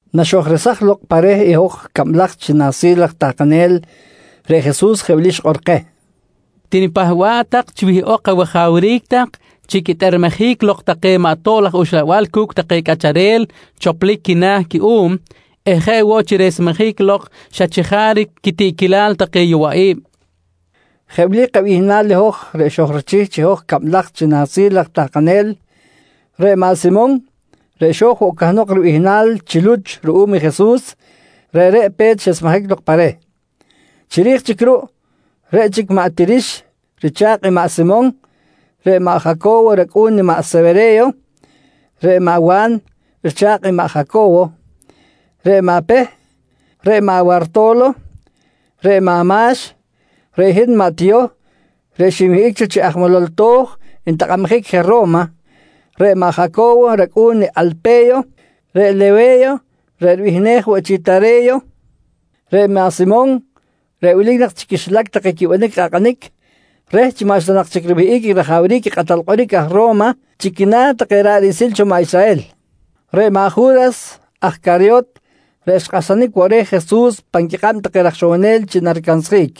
Naxojresaj lok pa reh i hoj cablaj chi nahsil raj tahkanel, reꞌ Jesus jeꞌ wili xikꞌor keh: «Tinipahba̱ꞌ tak chi wihꞌok awajawric tak chi quitꞌermejic lok take maꞌ tob laj uxlabal cu̱cꞌ take cꞌacharel choplic quina̱ cuꞌum eh jeꞌ woꞌ chi resmejic lok xa chajaric quitiꞌquilal take yowaꞌi̱b, nqui keh. Jeꞌ wili kabihnal i hoj reꞌ xojrichih chi hoj cablaj chi nahsil raj tahkanel: Reꞌ maꞌ Simon reꞌ xo̱j woꞌ cahnok ribihnal chi Luch ruꞌum i Jesus, reꞌreꞌ pe̱t xesmejic lok pa reh. Chiri̱j chic ruꞌ, reꞌ chic maꞌ Tirix richa̱kꞌ i maꞌ Simon, reꞌ maꞌ Jaco̱wo racꞌu̱n i maꞌ Sewere̱yo, reꞌ maꞌ Wa̱n richa̱kꞌ i maꞌ Jaco̱wo, reꞌ maꞌ Peh, reꞌ maꞌ Warto̱lo, reꞌ maꞌ Ma̱x, reꞌ hin maꞌ Tiyoh reꞌ xinwihꞌic cho chi aj molol to̱j ntakꞌabjic je Ro̱ma, reꞌ maꞌ Jaco̱wo racꞌu̱n Alpe̱yo, reꞌ Lewe̱yo reꞌ ribihnej woꞌ chi Tare̱yo, reꞌ maꞌ Simon reꞌ wilic nak chi quixilac take quibanic i kꞌakꞌanic reh chi maꞌxta nak chic riwihꞌic rajawric i kꞌatal kꞌoric aj Ro̱ma chi quina̱ take ra̱ꞌ riꞌsil cho maꞌ Israhel. Reꞌ maꞌ Ju̱ras aj Caryot reꞌ xkꞌahsanic woꞌ reh Jesus pan quikꞌab take raj ixowonel chi naricansjic.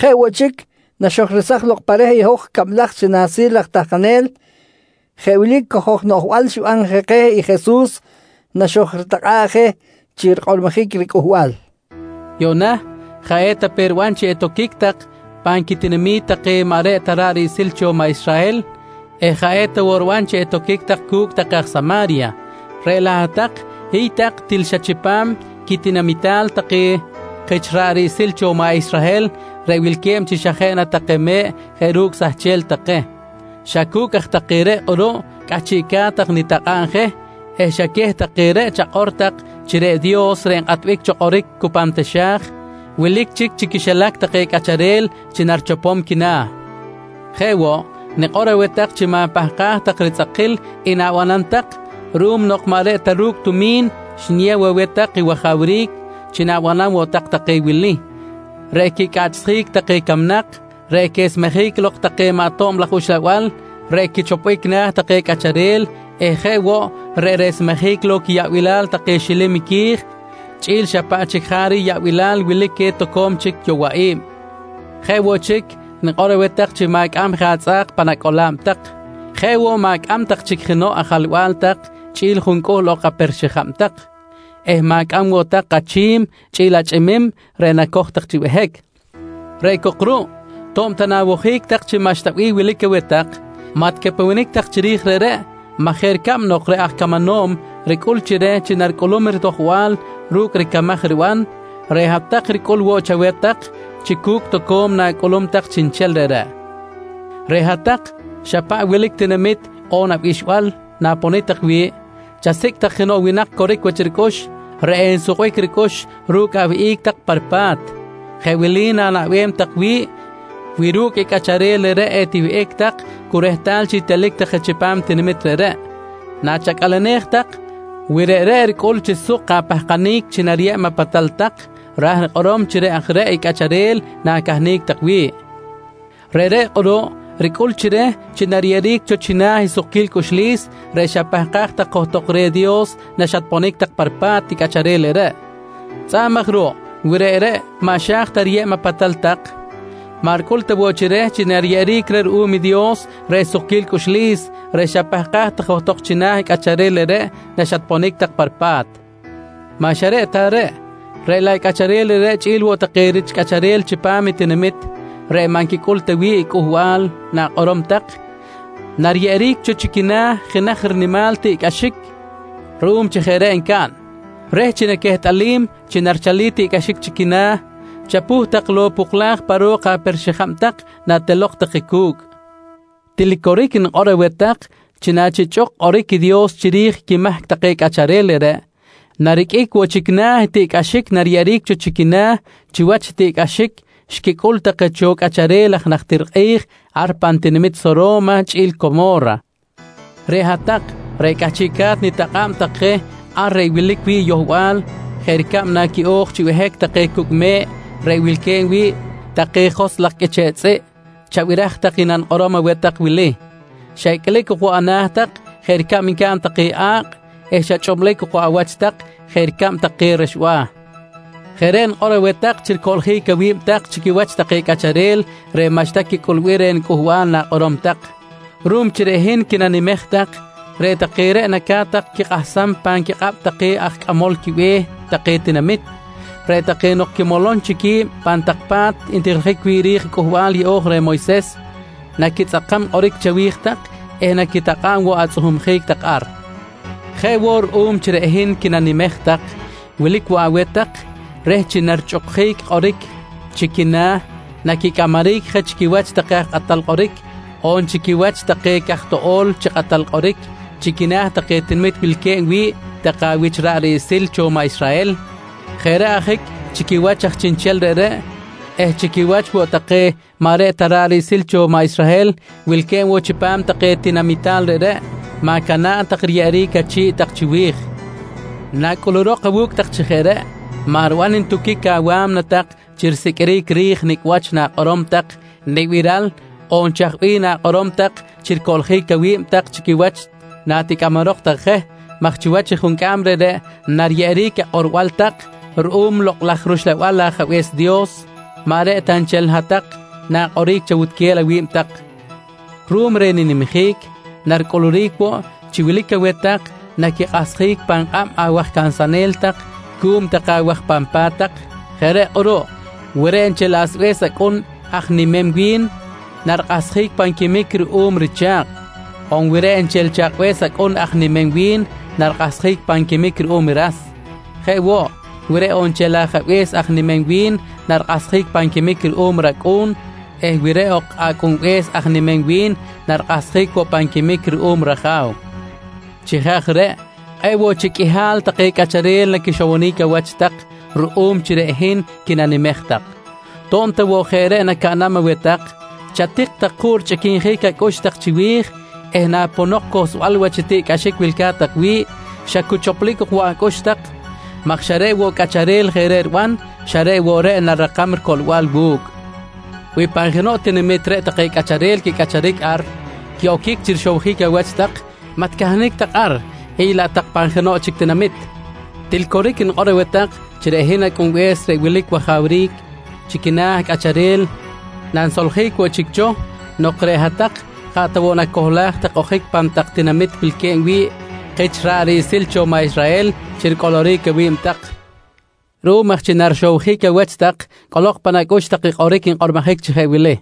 Jeꞌ woꞌ chic naxojresaj lok pa reh i hoj cablaj chi nahsil raj tahkanel, jeꞌ wili i cojoj noꞌjbal xiban je keh i Jesus naxojritakꞌa̱ꞌ je chi rikꞌormojic riCꞌuhbal: «Yuꞌna, jaꞌ eta pe riban chi etoquic tak pan quitinami̱t take maꞌ reꞌ ta ra̱ꞌ riꞌsil cho maꞌ Israhel eh jaꞌ eta woꞌ riban chi etoquic tak cu̱cꞌ take aj Sama̱rya, reꞌ laꞌ hat-tak hiy tak til xa chipam quitinamital take kich ra̱ꞌ riꞌsil cho maꞌ Israhel reꞌ wilque̱b chi xa jeꞌ na take me̱ꞌ jeꞌ ru̱cꞌ sahchel take. Xa cu̱cꞌ aj take reꞌ kꞌuruꞌ cꞌahchiꞌca̱t tak nitakꞌa̱b je eh xa queh take reꞌ chakꞌor tak chi reꞌ Dios reꞌ nkꞌatbic cho kꞌoric cu pan taxa̱j, wilic chic chi quixilac take cꞌacharel chi narichopom quina̱. Jeꞌ woꞌ, nikꞌor aweh tak chi ma̱pahkaj tak ritzꞌakil i na̱banam tak ruꞌum nok maꞌ reꞌ ta ru̱cꞌ tumi̱n xniyew aweh tak i wajawric chi na̱banam woꞌ tak take wili: Reꞌ quicꞌaꞌchsjic take camnak, reꞌ quesmejic lok take maꞌ tob laj uxlabal reꞌ quichopbic na̱ take cꞌacharel eh jeꞌ woꞌ reꞌ resmejic lok quiyaꞌbilal take xilim qui̱j chꞌi̱l xa paꞌ chic jaric yaꞌbilal wilic queh toco̱m chic yowaꞌi̱b. Jeꞌ woꞌ chic, nikꞌor aweh tak chi ma̱cꞌam tak je atzꞌa̱k pan acꞌola̱b tak, jeꞌ woꞌ ma̱cꞌam tak chic jenoꞌ ajalba̱l tak chꞌi̱l juncꞌuhl ok chic aper-xijab tak eh ma̱cꞌam woꞌ tak je achi̱m chꞌi̱l achꞌimim reꞌ nacoj tak chi behic. Reꞌ cok ruꞌ, to̱b ta na̱wojic tak chi maꞌxta bih wilic aweh tak, maꞌ ticapewenic tak chiri̱j reꞌreꞌ maj jeꞌ ricab nok reꞌ aj camanom ricꞌul chi reh chi naricꞌulum ritojbal ru̱cꞌ ricamaj riban, reꞌ hat-tak ricꞌul woꞌ chaweh tak chi cu̱cꞌ toco̱m na̱cꞌulum tak chiꞌnchel reꞌreꞌ. «Reꞌ hat-tak, xa paꞌ wilic tinamit on abixbal na̱ponic tak wi̱ꞌ, chasicꞌ tak jenoꞌ winak coric wach ricꞌux reꞌ ensukbic ricꞌux ru̱cꞌ awihꞌic tak pa ripa̱t. Jeꞌ wili na̱naꞌbem tak wi̱ꞌ wi ru̱cꞌ i cꞌacharel reꞌreꞌ etiwihꞌic tak cu rehtal chic telic tak je chipam i tinamit reꞌreꞌ: Nachacꞌalenej tak, wi reꞌreꞌ ricꞌul chi suk apahkanic chi nariyeb apatal tak, ra̱j rikꞌorom chi reꞌ aj reꞌ i cꞌacharel na̱cahnic tak wi̱ꞌ. Reꞌreꞌ kꞌuruꞌ ricꞌul chi reh chi nariyeꞌeric cho china̱ i sukquil cꞌuxlis reꞌ xapahkaj tak johtok reh Dios naxatponic tak pa ripa̱t i cꞌacharel reꞌreꞌ. Tzꞌa̱b aj ruꞌ, wi reꞌreꞌ maꞌ xa̱j ta riyeb apatal tak, maꞌ ricꞌul ta woꞌ chi reh chi nariyeꞌeric reh ruꞌum i Dios reꞌ sukquil cꞌuxlis reꞌ xapahkaj tak johtok china̱ i cꞌacharel reꞌreꞌ naxatponic tak pa ripa̱t Maꞌ xa ta reꞌreꞌ, reꞌ laꞌ i cꞌacharel reꞌreꞌ chꞌi̱l woꞌ take rich cꞌacharel chipam i tinamit reꞌ maꞌ nquicꞌul ta wi̱ꞌ i cꞌuhbal na̱kꞌorom tak, nariyeꞌeric cho chi quina̱ jenaj rinimal tiꞌcꞌaxic ruꞌum chi jeꞌ reꞌ ncaꞌn. Reh chi naquehtꞌalim chi narichalic tiꞌcꞌaxic chi quina̱, chapuh tak lok i poklaj pa ro̱k aper-xijab tak natelok tak je cu̱cꞌ. Til coric nikꞌor aweh tak chi nachichꞌuk kꞌoric i Dios chiri̱j quimahc take cꞌacharel reꞌreꞌ, nariqꞌuic woꞌ chic na̱ i tiꞌcꞌaxic nariyeꞌeric cho chi quina̱ chiwach i tiꞌcꞌaxic xquicꞌul take cho cꞌacharel aj najtir kꞌi̱j ar pan tinamit Soro̱ma chꞌi̱l Como̱ra. «Reꞌ hat-tak reꞌ cꞌahchiꞌca̱t nitakꞌa̱b tak je ar reꞌ wilic wi̱ꞌ yohbal jeꞌ ricab naquiꞌo̱j chi behic take cu̱cꞌ me̱ꞌ reꞌ wilque̱b wi̱ꞌ take joskꞌ laj qꞌuiche̱ꞌ tzꞌiꞌ, chabiraj tak i nanikꞌorom aweh tak wili: Xa icꞌlic ok woꞌ ana̱ tak jeꞌ ricab ncaꞌn take a̱kꞌ eh xa chꞌublic ok woꞌ awach tak jeꞌ ricab take rexba̱. Jeꞌ reꞌ nikꞌor aweh tak chi ricoꞌljic awi̱b tak chi quiwach take cꞌacharel reꞌ maꞌxta quicꞌulbic reh i cꞌuhbal na̱kꞌorom tak. Ruꞌum chi reꞌ hin quinanimej tak, reꞌ take reꞌ naca̱t tak quikꞌahsam pan quikꞌab take aj cꞌamol quibe̱h take tinamit, reꞌ take nok quimolom chic qui̱b pan tak pa̱t ntijiljic wi̱ꞌ ri̱j Cꞌuhbal Yeꞌo̱j reh Moyses, naquitzꞌakam kꞌoric chawi̱j tak eh naquitakꞌa̱b woꞌ atzꞌuhumjic tak ar. Jeꞌ woꞌ ruꞌum chi reꞌ hin quinanimej tak, wilic woꞌ aweh tak reh chi narichꞌukjic kꞌoric chi quina̱, naquicꞌamaric je chi quiwach take kꞌatal kꞌoric on chi quiwach take caj toꞌo̱l chi kꞌatal kꞌoric chi quina̱ take tinamit wilque̱b wi̱ꞌ take awich rich ra̱ꞌ riꞌsil cho maꞌ Israhel. Jeꞌ reꞌ ajic chi quiwach aj chiꞌnchel reꞌreꞌ eh chi quiwach woꞌ take maꞌ reꞌ ta ra̱ꞌ riꞌsil cho maꞌ Israhel wilque̱b woꞌ chipam take tinamital reꞌreꞌ, ma̱cana̱ꞌ tak riyeꞌeric achi̱ꞌ tak chiwi̱j. Nacꞌulurok awu̱cꞌ tak chi jeꞌ reꞌ, maꞌ riban ntuquic awa̱mna tak chi risiqꞌuiric ri̱j nicꞌ wach na̱kꞌorom tak nibiral on chaj bih na̱kꞌorom tak chi ricoꞌljic awi̱b tak chi quiwach naticꞌamarok tak je maj chiwach i juncꞌam reꞌreꞌ nariyeꞌeric akꞌorbal tak ruꞌum Lokꞌ laj rUxlabal i Ajabe̱s Dios, maꞌ reꞌ ta nchel hat-tak na̱kꞌoric chawutquel awi̱b tak. «Ruꞌum reh ninimjic, naricꞌuluric woꞌ chi wilic aweh tak naquikꞌahsjic pan kꞌab awaj cansanel tak cuꞌum take awaj pan pa̱t tak. Jeꞌ reꞌ kꞌuruꞌ, wi reꞌ nchel asbe̱s acꞌun aj nimem wi̱n, narikꞌahsjic pan quimic ruꞌum richa̱kꞌ. On wi reꞌ nchel i chakꞌbe̱s acꞌun aj nimem wi̱n, narikꞌahsjic pan quimic ruꞌum i ras. Jeꞌ woꞌ, wi reꞌ ok nchel ajabe̱s aj nimem wi̱n, narikꞌahsjic pan quimic ruꞌum i racꞌu̱n eh wi reꞌ ok acꞌunbe̱s aj nimem wi̱n, narikꞌahsjic woꞌ pan quimic ruꞌum i raja̱w. Chi jeꞌ aj reꞌ, kꞌe̱ꞌ woꞌ chic qꞌuihal take cꞌacharel naquixowonic awach tak ruꞌum chi reꞌ hin quinanimej tak. To̱b ta woꞌ jeꞌ reꞌ nacaꞌnam aweh tak, chatik tak juꞌ richꞌiquinjic acꞌux tak chiwi̱j eh naponok i cohlsbal wach i tiꞌcꞌaxic wilca̱t tak wi̱ꞌ, xa cu choplic ok woꞌ acꞌux tak maj xa reꞌ woꞌ i cꞌacharel jeꞌ reꞌ riban, xa reꞌ woꞌ reꞌ narirakam ricoꞌlbal wu̱cꞌ. «Wi pan jenoꞌ tinamit reꞌ take cꞌacharel quicꞌacharic ar quiꞌo̱c chi rixowjic awach tak maꞌ ticahnic tak ar, hiy laꞌ tak pan jenoꞌ chic tinamit. Til coric nikꞌor aweh tak chi reꞌ hin Acꞌunbe̱s reꞌ wilic wajawric chi quina̱ cꞌacharel nanisoljic woꞌ chic cho nok reꞌ hat-tak jaꞌ ta woꞌ nacohlaj tak ojic pan tak tinamit wilque̱b wi̱ꞌ kich ra̱ꞌ riꞌsil cho maꞌ Israhel chi ricꞌoloric awi̱b tak. Ruꞌum aj chi narixowjic awach tak, cꞌolok pan acꞌux tak i kꞌoric nkꞌormojic chi jeꞌ wili: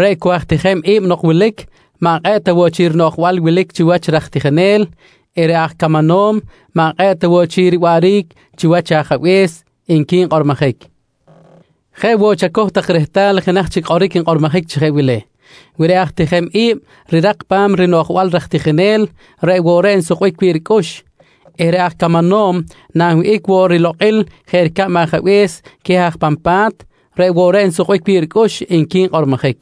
“Reꞌ cu aj tijem i̱b nok wilic, maꞌ kꞌe̱ꞌ ta woꞌ chic rinoꞌjbal wilic chiwach raj tijinel eh reꞌ aj camanom maꞌ kꞌe̱ꞌ ta woꞌ chic riwaꞌric chiwach i ajabe̱s, nqui nkꞌormojic. «Jeꞌ woꞌ chacoj tak rehtal i jenaj chic kꞌoric nkꞌormojic woꞌ chi jeꞌ wili: “Wi reꞌ aj tijem i̱b rirak pa̱m rinoꞌjbal i raj tijinel, reꞌ woꞌ reꞌ nsukbic wi̱ꞌ ricꞌux eh reꞌ aj camanom nanwihꞌic woꞌ rilokꞌil jeꞌ ricab i ajabe̱s queh aj pan pa̱t, reꞌ woꞌ reꞌ nsukbic wi̱ꞌ ricꞌux, nqui nkꞌormojic.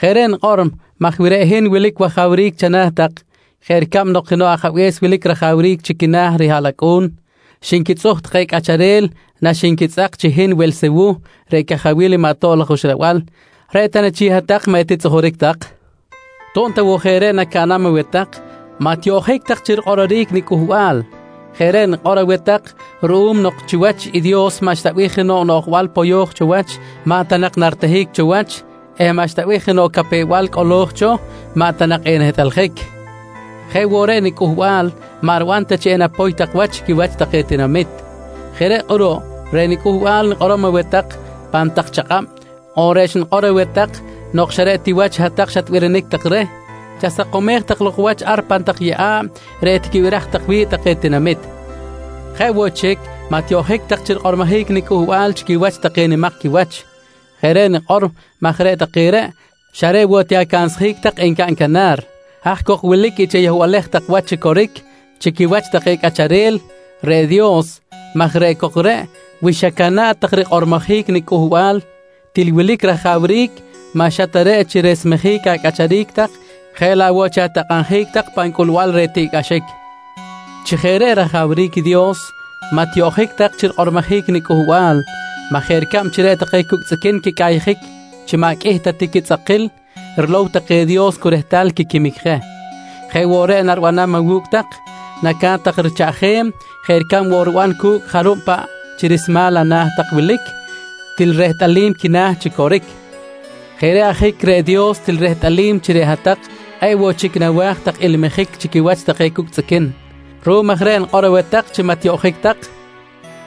«Jeꞌ reꞌ nikꞌor maj wi reꞌ hin reꞌ wilic wajawric chana̱ tak jeꞌ ricab nok jenoꞌ ajabe̱s wilic rajawric chi quina̱ rihaꞌlacꞌu̱n, xinquitzꞌuj take cꞌacharel naxinquitzꞌak chi hin Welsewuh reꞌ cajawil maꞌ tob laj uxlabal, reꞌ ta na chic hat-tak maꞌ etitzꞌujuric tak? To̱b ta woꞌ jeꞌ reꞌ nacaꞌnam aweh tak, maꞌ tiyoꞌjic tak chi rikꞌororic niCꞌuhbal. Jeꞌ reꞌ nikꞌor aweh tak ruꞌum nok chiwach i Dios maꞌxta bih jenoꞌ noꞌjbal poyo̱j cho wach maꞌ ta nak naritehic cho wach eh maꞌxta woꞌ bih jenoꞌ capew-bal cꞌolo̱j cho, maꞌ ta nak enehtꞌaljic. Jeꞌ woꞌ reꞌ niCꞌuhbal maꞌ riban ta chi enapoy tak wach chi quiwach take tinamit. Jeꞌ reꞌ kꞌuruꞌ reꞌ niCꞌuhbal nikꞌorom aweh tak pan tak chakꞌab, on reꞌ xnikꞌor aweh tak nok xa reꞌ wach hat-tak xatbirinic tak reh, chasakomej tak lok wach ar pan tak yeꞌa̱b reꞌ etiquibiraj tak wi̱ꞌ take tinamit. Jeꞌ woꞌ chic, maꞌ tiyoꞌjic woꞌ tak chi rikꞌormojic niCꞌuhbal chi quiwach take nimak quiwach. Jeꞌ reꞌ nikꞌor maj reꞌ take reꞌ xa reꞌ woꞌ ti acansjic encaꞌn canar. Haj cok wilic i chayohbalej tak wach chi coric chi quiwach take cꞌacharel, reꞌ Dios maj reꞌ cok reꞌ wi xacana̱ꞌ tak rikꞌormojic niCꞌuhbal, til wilic rajawric maꞌ xa ta reꞌ chi resmejic acꞌacharic tak jeꞌ laꞌ woꞌ chi atakꞌabjic tak pan cꞌulbal reh tiꞌcꞌaxic. Chi jeꞌ reꞌ rajawric i Dios, maꞌ tiyoꞌjic tak chi rikꞌormojic niCꞌuhbal maj jeꞌ ricab chi reꞌ take cucꞌ tzꞌiquin quicꞌayjic chi maꞌ qꞌuih ta ti quitzꞌakil, rilow take i Dios cu rehtal quiquimic je, jeꞌ woꞌ reꞌ naribanam awu̱cꞌ tak, naca̱t woꞌ tak richaꞌjem jeꞌ ricab woꞌ riban ru̱cꞌ i jarub paꞌ chi rismal ana̱ tak wilic til rehtꞌalim quina̱ chi coric. Jeꞌ reꞌ ajic reꞌ Dios til rehtꞌalim chi reꞌ hat-tak kꞌe̱ꞌ woꞌ chic nawa̱j tak ilmijic chi quiwach take cucꞌ tzꞌiquin. Ruꞌum aj reꞌ nikꞌor aweh tak chi maꞌ tiyoꞌjic tak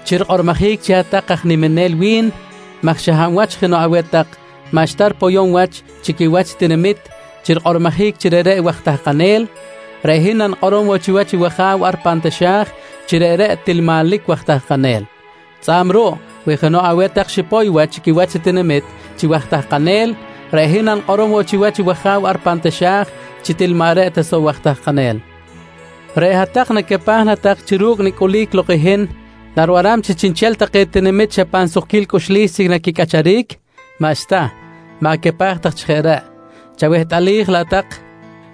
chi rikꞌormojic chi hat-tak aj niminel wi̱n maj xa hab wach jenoꞌ aweh tak maꞌxta ripoyom wach chi quiwach i tinamit chi rikꞌormojic chi reꞌreꞌ waj tahkanel, reꞌ hin nanikꞌorom woꞌ chiwach i wAja̱w ar pan taxa̱j chi reꞌreꞌ til manlic waj tahkanel. Tzꞌa̱b ruꞌ, wi jenoꞌ aweh tak xipoy wach chi quiwach i tinamit chi waj tahkanel, reꞌ hin nanikꞌorom woꞌ chiwach i wAja̱w ar pan taxa̱j chi til maꞌ reꞌ ta soꞌ waj tahkanel. «Reꞌ hat-tak, nacapaj na tak chi ru̱cꞌ nicꞌulic lok i hin, naribanam chi chiꞌnchel take tinamit xa pan sukquil cꞌuxlis chic naquicꞌacharic? Maꞌxta, ma̱capaj tak chi jeꞌ reꞌ. Chawehtꞌalij laꞌ tak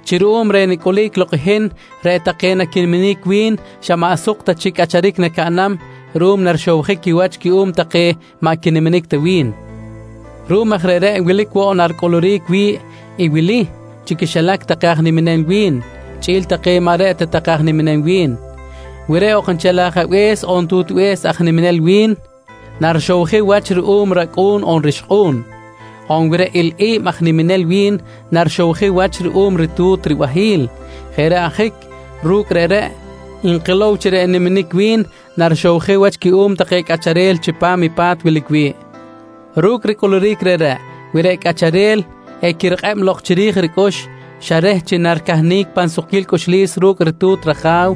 chi ruꞌum reh nicꞌulic lok i hin, reꞌ take naquiniminic wi̱n maꞌ xa suk ta chic cꞌacharic nacaꞌnam ruꞌum narixowjic quiwach cuꞌum take maꞌ quiniminic ta wi̱n. Ruꞌum aj reꞌreꞌ wilic woꞌ na naricꞌuluric wi̱ꞌ i wili chi quixilac take aj niminel wi̱n chꞌi̱l take maꞌ reꞌ ta take aj niminel wi̱n: Wi reꞌ ok nchel ajabe̱s on tutbe̱s aj niminel wi̱n, narixowjic riwach ruꞌum racꞌu̱n on rixkꞌu̱n. On wi reꞌ ilꞌi̱b aj niminel wi̱n, narixowjic wach ruꞌum ritu̱t ribahi̱l. Jeꞌ reꞌ ajic, ru̱cꞌ reꞌreꞌ nkilow chi reꞌ n-niminic wi̱n narixowjic wach cuꞌum take cꞌacharel chipam i pa̱t wilic wi̱ꞌ. Ru̱cꞌ ricꞌuluric reꞌreꞌ, wi reꞌ cꞌacharel equirikꞌeb lok chiri̱j ricꞌux xa reh chi naricahnic pan sukquil cꞌuxlis ru̱cꞌ i ritu̱t raja̱w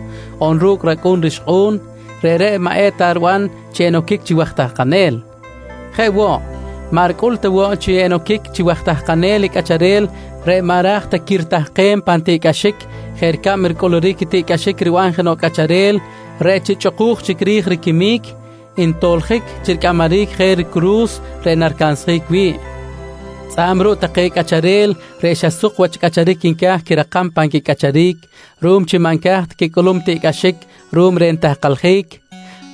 on ru̱cꞌ racꞌu̱n rixkꞌu̱n, reꞌreꞌ maꞌ eta riban chi enoquic chi waj tahkanel. Jeꞌ woꞌ, maꞌ ricꞌul ta woꞌ chi enoquic chi waj tahkanel i cꞌacharel reꞌ maꞌ ra̱j ta qui̱n ritahkem pan tiꞌcꞌaxic jeꞌ ricab ricꞌuluric tiꞌcꞌaxic riban jenoꞌ cꞌacharel reꞌ chi chꞌuku̱j chic ri̱j riquimic, ntoljic chi ricꞌamaric je ricuru̱s reꞌ naricansjic wi̱ꞌ. Tzꞌa̱b ruꞌ take cꞌacharel reꞌ xa suk wach cꞌacharic nca̱j quirakam pan quicꞌacharic ruꞌum chi maꞌ nca̱j ta quicꞌulum i tiꞌcꞌaxic ruꞌum reh nitahkaljic,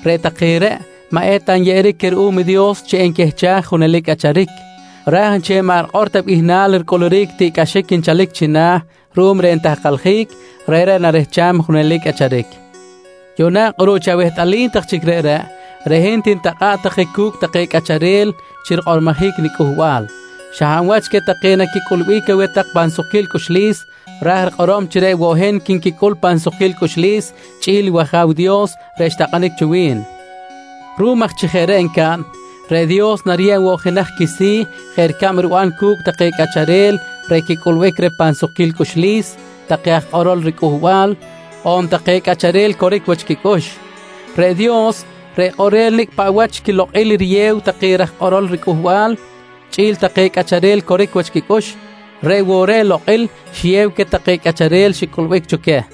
reꞌ take reꞌ maꞌ eta nyeꞌeric queh ruꞌum i Dios chi enquehchaj i junelic cꞌacharic, raj nchel i maꞌ rikꞌor ta bihnal ricꞌuluric i tiꞌcꞌaxic nchalic china̱ ruꞌum reh nitahkaljic, reꞌreꞌ narehcham i junelic cꞌacharic. «Yuꞌna kꞌuruꞌ chi awehtꞌalim tak chic reꞌreꞌ, reꞌ hin tinitakꞌa̱ꞌ tak je cu̱cꞌ take cꞌacharel chi rikꞌormojic niCꞌuhbal. Xa hab wach queh take naquicꞌulbic aweh tak pan sukquil cꞌuxlis, ra̱j rikꞌorom chi reꞌ woꞌ hin quinquicꞌul chi pan sukquil cꞌuxlis chꞌi̱l i wAja̱w Dios reꞌ xtakꞌanic cho wi̱n. Ruꞌum aj chi jeꞌ reꞌ encaꞌn, reꞌ Dios nariyeb woꞌ jenaj quisi̱ jeꞌ ricab riban cu̱cꞌ take cꞌacharel reꞌ quicꞌulbic reh pan sukquil cꞌuxlis take aj kꞌorol riCꞌuhbal on take cꞌacharel coric wach quicꞌux. Reꞌ Dios, reꞌ kꞌorel nicꞌ paꞌ wach quilokꞌil riyew take raj kꞌorol riCꞌuhbal chꞌi̱l take cꞌacharel coric wach quicꞌux, reꞌ woꞌ reꞌ lokꞌil xiyew queh take cꞌacharel xicꞌulbic cho queh.